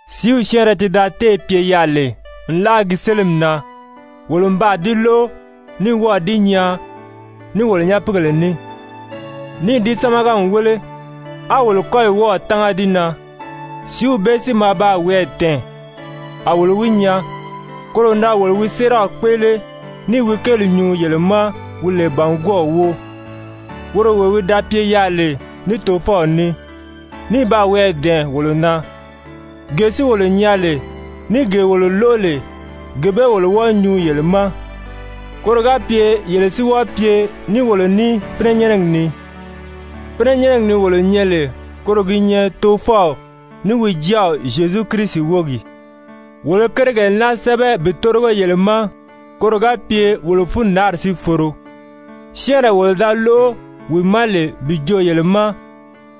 Sìíw syɛ́ɛnrɛ ti da téè pye yaà lè nlaa gi sélimi na, wolo n baa di lóʔo, ní wɔ́ɔ̀ di nyaa ní wolo nyapiigèle ní, níì di sámaga n wéle, á wolo kɔ́yi wɔ́ɔ̀ tánga di na, sìíw bee si maa baa wiyɛɛ dɛ̀ɛn, a wolo wi nyaa, koro na wolo wi séeraw kpéʔele ní i wi kéeli nyuu yele ma wi lè bàngwɔɔw wóo, woro wee wi da pye yaà lè ní Tofɔw ní, ní baa wiyɛɛ dɛ̀ɛn wolo na, gee si wolo nyaa lè, ní gee wolo lóʔo lè, gee bee wolo wɔ́ɔ̄ nyuu yele ma, koro ga pye yele si wɔ́ɔ pye ní wolo ní pínɛnyɛnnɛgi ni. Pínɛnyɛnnɛgi ni wolo nyɛ lè koro gi nyɛ Tofɔw, ní wi Jáaw Zyezu Kirisi wógi. Wolo i kérigèle naa sɛ́bɛ bi tórigo yele ma koro ga pye wolo fundaanri si foro. Syɛ́ɛnree wolo da lóʔo wi ma lè bi joo yele ma,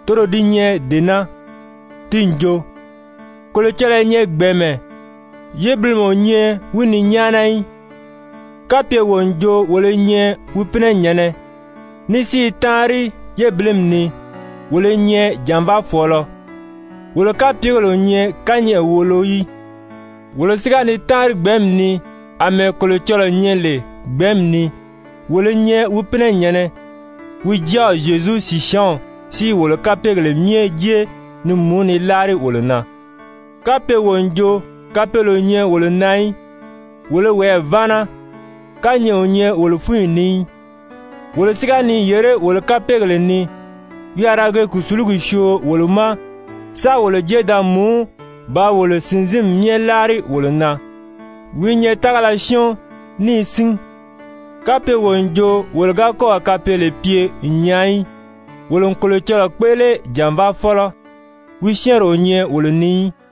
toro di nyɛ dee naa, ti n jo: Kolocɔlɔɔ i nyɛ gbɛ̀ɛnmɛ, yébilimɛ o nyɛ wi ni nyáana í. Kapye wo n jo wolo i nyɛ wi pínɛnyɛ̀nnɛ, ní si i táanri yébilimi ni, wolo i nyɛ jànvaafɔɔlɔ, wolo kapyegèle o nyɛ kányɛʔɛ wòʔolo í. Wolo si ga ni táanri gbɛ̀ɛ́nmi ni àmɛɛ Kolocɔlɔɔ nyɛ lè gbɛ̀ɛ́nmi ni, wolo i nyɛ wi pínɛnyɛ̀nnɛ, wi Jáaw Zyezu sìsyaanw si i wolo kapeegèle myɛ jé ni mùú ni láari wolo na. Kapye wo n jo kapeele o nyɛ wolo na í, wolo i woyɛɛ váana, kányɛʔɛ o nyɛ wolo fúnyi ni í. Wolo si ga ni yèré wolo kapeegèle ni, wi a ra ge kùsulugi syoo wolo ma sáā wolo jé da mùú bàā wolo sìnzinmi myɛ láari wolo na, wi i nyɛ tágala syɔ́ɔn níì sín. Kapye wo n jo wolo ga kɔ́ɔ̀ kapeele pye n nyaa í, wolo n Kolocɔlɔɔ kpéʔele jànvaafɔlɔ, wi syɛ́ɛnri o nyɛ wolo ni í.